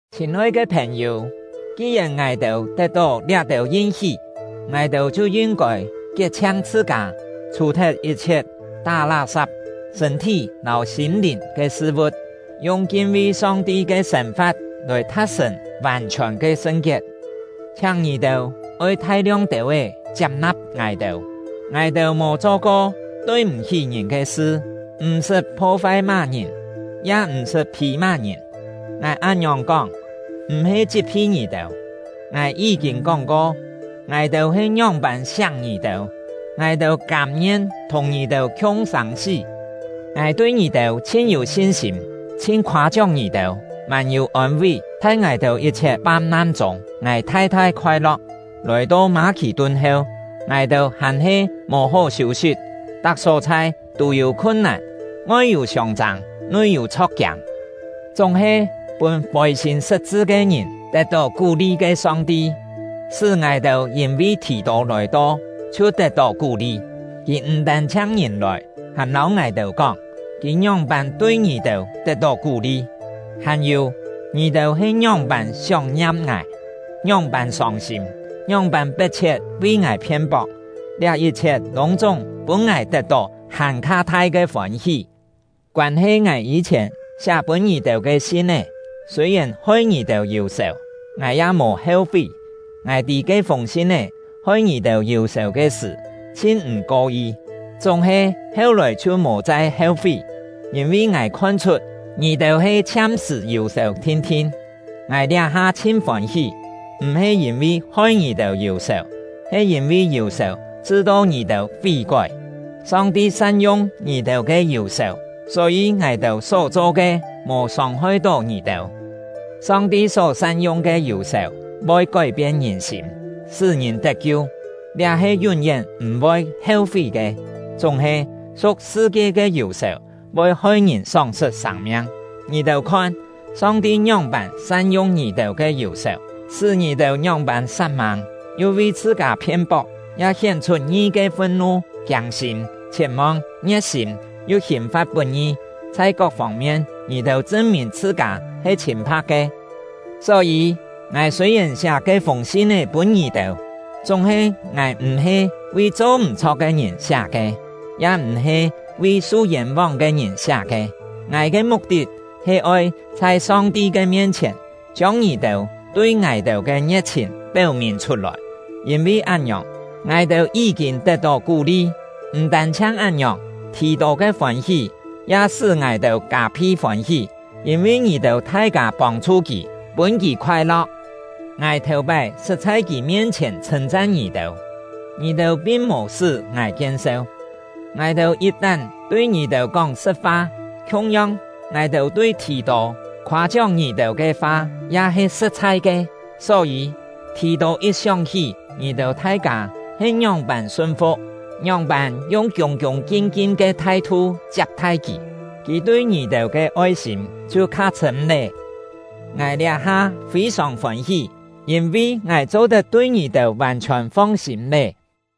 Chhîn-oi ke phèn-yû, ki-yèn ngài-têu tet-tó liá-têu yin-hí, ngài-têu chhiu yin-kôi kiet-chhiang chhṳ-kâ, chhù-thet yit-chhiet tá lá-sap sṳ̂n-thí lâu sîm-lìn ke sṳ-vu̍t, yung kin-vi Song-ti ke sên-fa̍t lòi tha̍t-sṳ̀n vàn-chhiòn ke sṳn-kiet. Chhiáng ngì-têu oi thai-liong têu-é chiap-na̍p ngài-têu. Ngài-têu mò cho-ko tui-m̀-hí ngìn ke sṳ; m̀-sṳt pho-fai má-ngìn, ya m̀-sṳt phî má-ngìn. Ngài án-ngiòng kóng, m̀-he chit-phi ngì-têu. Ngài yí-kîn kóng-ko, ngài-têu he ngióng-pân siak ngì-têu; ngài-têu kâm-ngien thùng ngì-têu khiung sâng-sí. Ngài tui ngì-têu chhin yû sin-sîm, chhin khoâ-chióng ngì-têu, mân-yû ôn-ví; chhai ngài-têu yit-chhiet fam-nan chûng, ngài thai-thai khoai-lo̍k. Lòi-to Mâ-khì-tun heu, ngài-têu hàn-he mò hó hiû-sit. Tak só-chhai tû yû khun-nàn, ngoi yû siông-châng, nui yû chho̍k-kiâng. Chúng-he, pûn fôi-sîm sṳt-chṳ ke ngìn tet-tó kú-li ke Song-ti, sṳ́ ngài-têu yîn-vi Thì-tô lòi-to chhiu tet-tó kú-li. Kì m̀ tân-chhiang ngìn lòi, hàn lâu ngài-têu kóng, kì ngióng-pân tui ngì-têu tet-tó kú-li, hàn-yû, ngì-têu he ngióng-pân sióng-ngiam ngài, ngióng-pân sông-sîm, ngióng-pân pet-chhiet vi ngài phien-pok; liá yit-chhiet lûng-chúng pûn ngài tet-tó hàn-kha thai ke fôn-hí. Koân-he ngài yî-chhièn siá pûn ngì-têu ke sin-é, sûi-yèn hoi ngì-têu yù-sèu, ngài ya mò heu-fí. Ngài tî ke-fûng sin-é hoi ngì-têu yù-sèu ke sṳ̀, chhin m̀ ko-yi; chúng-he heu-lòi chhiu mò chai heu-fí, yîn-vi ngài khon-chhut ngì-têu he chhiam-sṳ̀ yù-sèu thin-thin. Ngài liá-ha chhin fôn-hí, m̀-he yîn-vi hoi ngì-têu yù-sèu, he yîn-vi yù-sèu chṳ-to ngì-têu fí-kói. Song-ti san-yung ngì-têu ke yù-sèu, só-yî ngài-têu só-cho ke mò sông-hoi-tó ngì-têu. Song-ti só san-yung ke yù-sèu voi kói-pien ngìn-sîm, sṳ́ ngìn tet-kiu; liá he yún-yén m̀-voi heu-fí ke! Chúng-he, su̍k sṳ-kie ke yù-sèu voi hoi ngìn sóng-sṳt sâng-miang. Ngì-têu khon, Song-ti ngióng-pân san-yung ngì-têu ke yù-sèu, sṳ́ ngì-têu ngióng-pân sat-mâng, yu vi chhṳ-kâ phien-pok, ya hién-chhut ngi ke fun-nu, kiâng-sîm, chhiet-mong, ngie̍t-sîm, yu hìn-fa̍t put-ngi! Chhai kok fông-mien ngì-têu chṳn-mìn chhṳ-kâ he chhîn-pha̍k ke. Só-yî, ngài sûi-yèn siá ke-fûng sin-é pûn ngì-têu, chúng-he ngài m̀-he vi cho m̀-chho̍k ke ngìn siá ke, ya m̀-he vi su yên-vóng ke ngìn siá ke. Ngài ke muk-tit he oi chhai Song-ti ke mien-chhièn, chiông ngì-têu tui ngài-têu ke ngie̍t-chhìn péu-mìn chhut-lòi. Yîn-vi án-ngiòng, ngài-têu yí-kîn tet-tó kú-li. M̀ tân-chhiang án-ngiòng, Thì-tô ke fôn-hí ya sṳ́ ngài-têu kâ-phi fôn-hí; yîn-vi ngì-têu thai-kâ pông-chhu kì, pûn kì khoai-lo̍k. Ngài thèu-pái sṳt chhai kì mien-chhièn chhṳ̂n-chan ngì-têu, ngì-têu pin mò sṳ́ ngài kien-seu. Ngài-têu yit-tán tui ngì-têu kóng sṳ̍t-fa; khiung-yong, ngài-têu tui Thì-tô khoâ-chióng ngì-têu ke fa ya he sṳ̍t-chhai ke. Só-yî, Thì-tô yit sióng-hí ngì-têu thai-kâ he ngióng-pân sun-fu̍k, ngióng-pân yung kiûng-kiûng kin-kin ke thai-thu chiap-thai kì, kì tui ngì-têu ke oi-sîm chhiu kha chhṳ̂m lé. Ngài liá-ha fî-sòng fôn-hí, yîn-vi ngài cho-tet tui ngì-têu vàn-chhiòn fong-sîm lé!